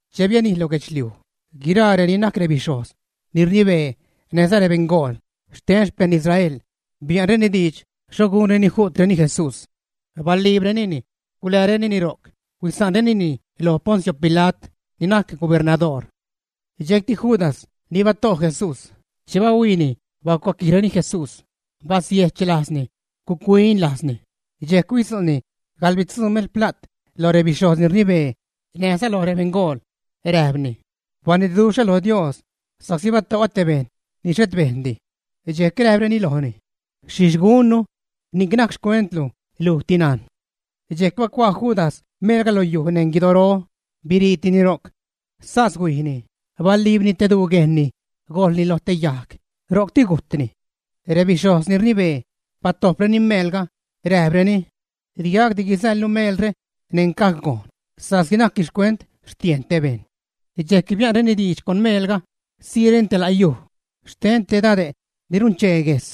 Che bianij lo guedxliuj, guiraa reni najc rebixhojz ni rnibee näjza rebeṉgool xten rexpejṉ Israel bia'nreni diidx xho gunreni ju'treni Jesús. Baliibrenini, guläärenini ro'c, huisa'nrenini loj Poncio Pila't, ni najc gubernadoor. Dxejcti Judas, ni bato' Jesús, che bahuiini bacuaquijreni Jesús, basiejch lajzni, guc-huin lajzni, dxejc huidzu'ni gaḻbitzuu meel pla't loj rebixhojz ni rnibee näjza loj rebeṉgool. Räjpni: ―Banitduxhä lo Dios sa'csi bato'ä te bejṉ ni xhet bejndi. Dxejc räjpreni lojni: ―Xhixh gunnu. Ni'c najc xcuentlu; lujti najn. Dxejc bacuaa Judas meelga lo yuj neṉ guidoro, biriitini ro'c. Sas huijni, baliibni te duu guejnni, gojḻni lo te yajg, ro'cti gujtni. Rebixhojz ni rnibee batojpreni meelga, räjpreni: ―Di gac di guizäḻnu meelre neṉ caj gojn sa'csi najcni xcuent xtiejn te bejṉ. Dxejc bia'nreni diidx con meelga siireni te la' yuj xten te dade' ni runchee guejs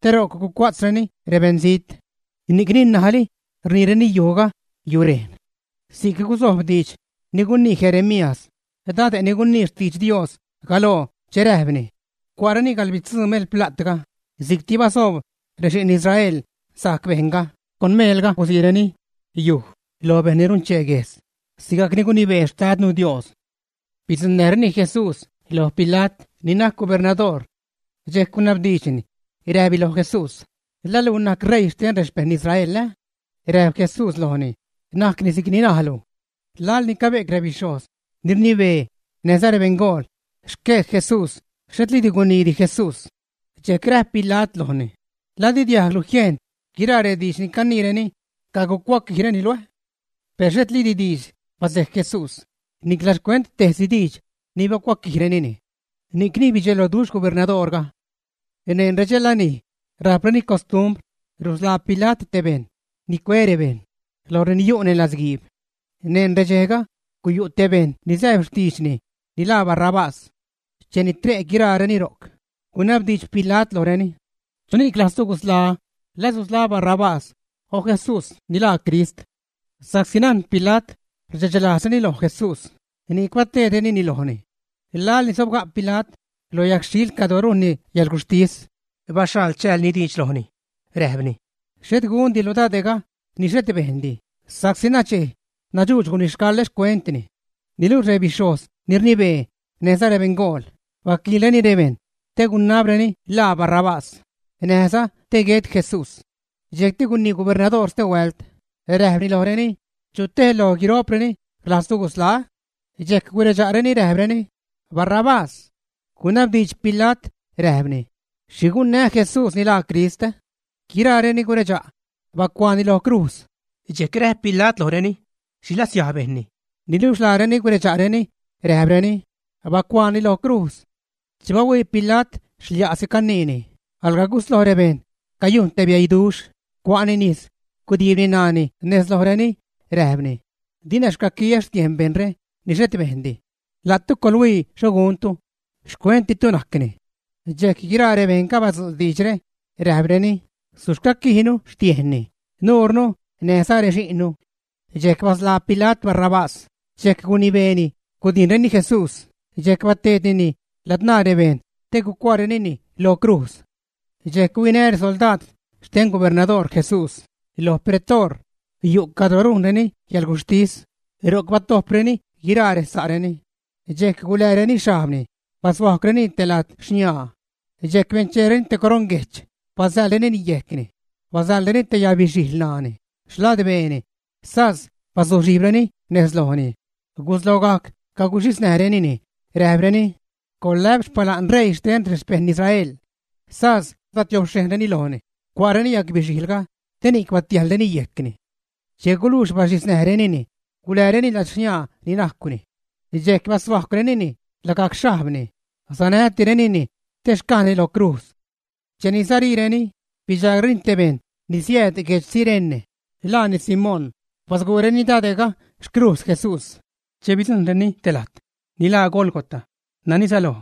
te ro'c gucua'tzreni rebeṉzijt. Ni'cni ṉajli rniireni yujga: “Yurejn”. Si'c gusojb diidx ni gunii Jeremías, dade' ni gunii xtidx Dios galoo che räjpni: “Cua'reni gaḻbitzuu melpla'tga si'cti basoob rexi'n Israel sajc bejṉga. Con meelga guziireni yuj lo bejṉ ni runchee guejs, sigacni gunibee xtadnu Dios.” Bidzuṉnäjreni Jesús loj Pila't ni najc gubernadoor. Dxejc gunabdiidxni, räjpni lo Jesús: ―¿La luj najc ṟeii xten rexpejṉ Israel, ä? Räjp Jesús lojni: ―Najcni si'cni najlu. Laḻni cabe'c rebixhojz ni rnibee näjza rebeṉgool rexquej Jesús xhetliidi guniidi Jesús. Dxejc räjp Pila't lojni: ―¿La di diajglu jiejn guiraa rediidx ni caniireni cagucuaquijreni luj, ä? Per xhetliidi diidxdi basejc Jesús, nicla xcuent tejsi diidx ni bacuaquijrenini. Ni'cni bidxeloduxh gubernadoorga. Neṉ redxe lanij rajpreni costumbr rusḻaa Pila't tej bejṉ ni cue rebejṉ loj reni yu' neṉ latzguiib. Neṉ redxejga guyu' te bejṉ ni sääb xtiidxni ni laa Barrabás. Cheni tre' guiraareni ro'c, gunabdiidx Pila't lojreni: ―¿Chuni'c rlajztu gusḻaä́, la susḻaä Barrabás o Jesús ni laa Crist? Sa'csi najn Pila't rdxe'chlajzreni lo Jesús, ni'c bateedrenini lojni. Laḻ ni sobga' Pila't lo yajgxhiil cadro rujnni yäḻguxhtis, baxhaḻ chäälni diidx lojni, räjpni: ―Xhet gundilu dade'ga ni xhet bejndi, sa'csi nuchej nadxuudx gunixcaḻä xcuentni. Niluxh rebixhojz ni rnibee näjza rebeṉgool baquiilreni rebejṉ te gunabreni ḻaa Barrabás, näjza te guet Jesús. Dxejcti gunii gubernadoor stehuält, räjpni lojreni: ―¿Chu tej loj guiro'preni rlajztu gusḻaä́? Dxejc guredxa'reni, räjpreni: ―¡Barrabás! Gunabdiidx Pila't, räjpni: ―¿Xhi gunnää́ Jesús ni laaza Crist? Guiraareni guredxa': ―Bacuaani lo crujz. Dxejc räjp Pila't lojreni: ―¿Xhi latsiaj bejnni? Niluxh laareni guredxa'rureni, räjpreni: ―¡Bacuaani lo crujz! Che bahuii Pila't xlia'si caniini, alga gusloj rebejṉ cayujn te bieiduxh, cua'ni nis, gudiibni ṉaani nez lojreni, räjpni: ―Dina xcaquiä xtiejn bejṉre ni xhet bejndi. La'tu coḻhuii xho guntu. Xcuenttitu najcni. Dxejc guiraa rebejṉga badzu' diidxre, räjpreni: ―Suxcaquijnu xtiejnni, nuurnu näjza rexi'nnu. Dxejc basḻaa Pila't Barrabás, dxejc gunibeeni gudijnreni Jesús dxejc bateednini ladzṉaa rebejṉ te gucuaarenini lo crujz. Dxejc huinä resoldaad xten gubernadoor Jesús lo pretoor, yu' cadro rujnreni yäḻguxhtis, ro'c batojpreni guiraa resa'reni. Dxejc gulääreni xhajbni, bashuajcwrenini te lad xniaa. Dxejc bencheereni te coroṉ guejch, basäḻrenini yejcni, basäḻreni te yabixijl ṉaani, xladbeeni, sas bazuxhijbreni nez lojni guslogajc caguxhisnäjrenini, räjpreni: ―¡Coḻlä'p xpala'n ṟeii xten rexpejṉ Israel! Sas batiobxhejnreni lojni, cua'reni yabixijlga te ni'c batiäjlreni yejcni. Che gulujx baxhiznäjrenini, gulääreni lad xniaa ni najcwni. Dxejc bashuacwsacrenini lagajc xhajbni, sanätirenini te xcajni lo crujz. Cheni sariireni, bidxaagreni te bejṉ ni siääd guedx Cirene, laani Simón, basguureni dade'ga xcrujz Jesús. Che bidzujṉreni te lajt ni laa Gólgota, nani säloj: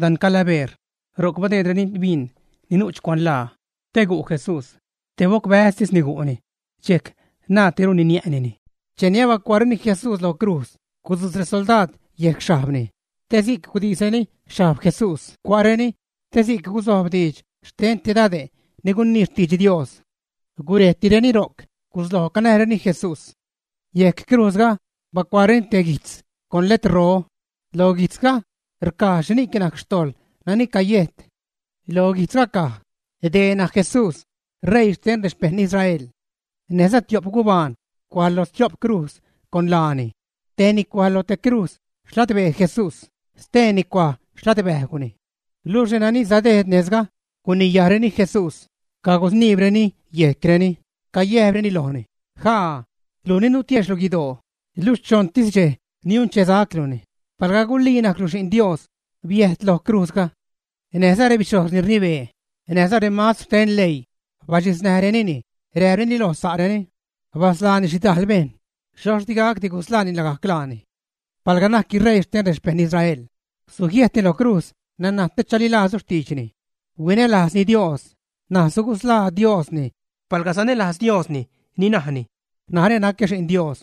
dan Calabeer, ro'c badeedreni bin nu'ch cuanlaa te gu' Jesús. Te bocbäztisni gu'ni, dxejc naaddiruni niä'nini. Cheni abacuaareni Jesús lo crujz, gudzujt resoldaad yejc xhajbni, te si'c gudisreni xhajb Jesús cua'reni, te si'c guzojb diidx xten te dade' ni gunii xtidx Dios. Gurejtireni ro'c, gusloj canäjreni Jesús. Yejc crujzga bacuaareni te guijtz con letrro. Lo guijtzga rcaj xhini'c najc xtojḻ nani cayejt. Lo guijtzga caj: “Dee najc Jesús ṟeii xten rexpejṉ Israel.” Näjza tio'p gubaan cuaj lo stio'p crujz con laani. Tejni cuaj lo te crujz xladbee Jesús, steeni cuaj xladbäjgwni. Luxh renani sadejd nejzga guniyajreni Jesús, cagusniibreni yejcreni, cayäjpreni lojni: ―¡Ja'ä! Luj ni nutiexhlu guidoo, luxh choṉtis dxej niunchesacluni; palga gulii najclu Xi'n Dios, biäjt loj crujzga. Näjza rebixhojz ni rnibee, näj remastr xten leii, baxhiznäjrenini räjpreni loj sa'reni: ―Basḻaani xhidajl bejṉ, xhoxh di gacdi gusḻaani lagajc laani. Palga najcni ṟeii xten rexpejṉ Israel, sujiäjtni lo crujz naṉaj te chalilajznu xtiidxni. Huinälajzni Dios, ṉaj sugusḻaa Diosni palga sanälajz Diosni; ni najni: “Narä nacä Xi'n Dios.”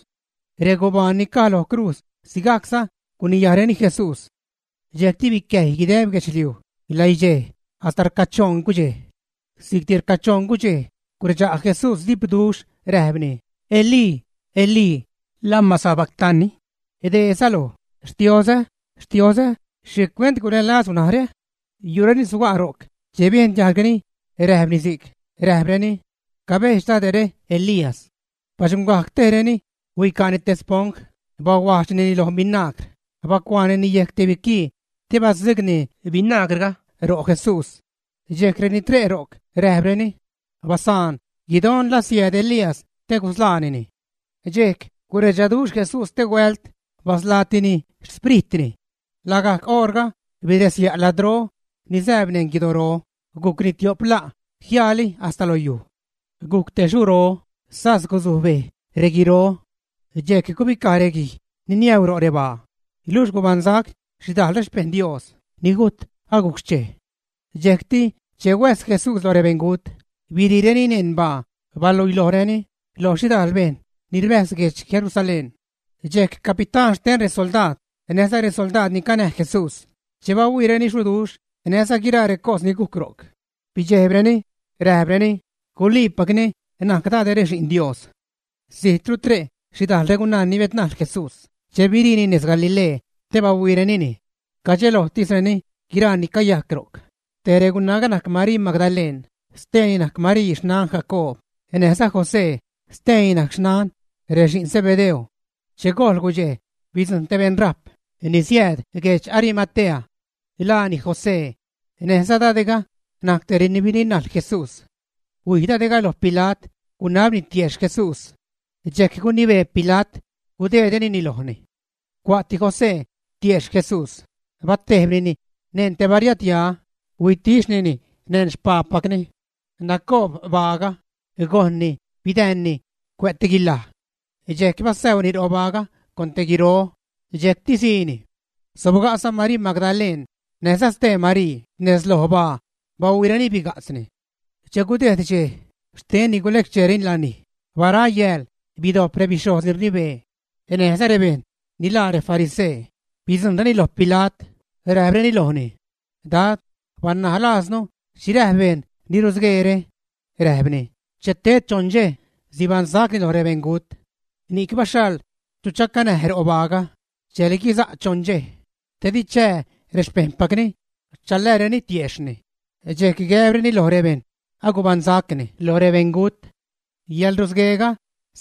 Regubaan ni caj lo recrujz sigajcza guniyajreni Jesús. Dxejcti bicäjy guideb guedxliuj läidxej hasta rcachoṉ gudxej. Si'cti rcachoṉ gudxej guredxa' Jesús dipduxh, räjpni: ―Elí, Elí, ¿lama sabacatani? ―dee säloj: Xtiozä, Xtiozä, ¿xhicuent gulälazlu narä? Yu' reni suga' ro'c, che biejn diajgreni räjpni si'c, räjpreni: ―Cabejdx Dade're Elías. Baxuṉgajc tejreni, huica'ni te sponj, bahuajdxnini loj binagr, bacuaanini yejc te biquii te badzugni binagrga ro' Jesús. Dxejc reni tre' ro'c räjp: ―Basaan; guidon la siääd Elías te gusḻaanini. Dxejc guredxaduxh Jesús stehuält, basḻaatini xpritni. Lagajc oṟga biräsya' ladro ni zääb neṉ guidoro, gujcni tio'p la' jiaali hasta lo yuj. Gujc te xuro, sas gusuj bej reguiro. Dxejc gubicaj reguij ni niäuu ro' rebaa, luxh gubaṉsac xhidajl xpejṉ Dios ni gujt aguc xchej. Dxejcti, che huäjs Jesús lo rebeṉgut, biriireni neṉ baa, baluilojreni lo xhidajl bejṉ ni rbäjz guedx Jerusalén. Dxejc capitán xten resoldaad näjza resoldaad ni canäj Jesús, che bahuiireni xuduxh näjza guiraa recos ni gujc ro'c, bidxejbreni, räjpreni: ―Guliipacni najc dade're Xi'n Dios. Zijtru tre' xhidajl regunaa ni biädnajl Jesús che biriini nez Galilee te bahuiirenini. Cadxelojtisreni guiraa ni cayajc ro'c. Tej regunaaga najc Marii Magdaleṉ, steeni najc Marii xnan Jacoob näjza José, steeni najc xnan rexi'n Zebedeo. Che gojl gudxej, bidzujṉ te beṉrajp ni siääd guedx Arimatea; laani José. Näjza dade'ga najc tej reni birinajl Jesús. Huij dade'ga loj Pila't, gunabni tiejxh Jesús. Dxejc gunibee Pila't gudeedrenini lojni. Cua'ti José tiejxh Jesús, batejbnini neṉ te bariadya, huitixhnini neṉ xpaapacni. Nacoob baaga, gojnni bidäänni cuä' te guilaj. Dxejc basäuni ro' baaga con guiro, dxejcti siini. Sobga'za Marii Magdaleṉ näjza stee Marii nez loj baa, bahuiireni biga'tzni. Che gudejd dxej xten ni gulec-cheereni lanij, bara yääl bidojp rebixhojz ni rnibee näjza rebejṉ ni laa refarisee, bidzujṉreni loj Pila't, räjpreni lojni: ―Dad, banaj laaznu xhi räjp bejṉ ni rusgueere. Räjpni: “Che ted choṉ dxej sibaṉsacni loj rebeṉgut.” Ni'c baxhaḻ chu chacanäj ro' baaga dxejli guisa' choṉ dxej, te di chää rexpejṉpacni chaläärenini tiejxhni, dxejc gäbreni loj rebejṉ: “Agubaṉsacni loj rebeṉgut.” Yäḻrusgueega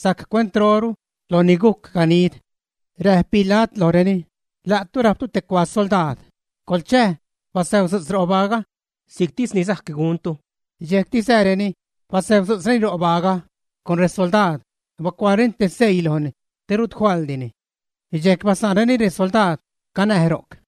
sajc cuentroru loj ni gujc ganid. Räjp Pila't lojreni: ―La'tu rajptu te cuaa soldaad; coḻchäj, basäutzu'tz ro' baaga si'ctis ni sajc guntu. Dxejcti sääreni, basäutzu'tzreni ro' baaga; con resoldaad bacuaareni te seii lojni te rut faḻdini. Dxejc basa'nreni resoldaad canäj ro'c.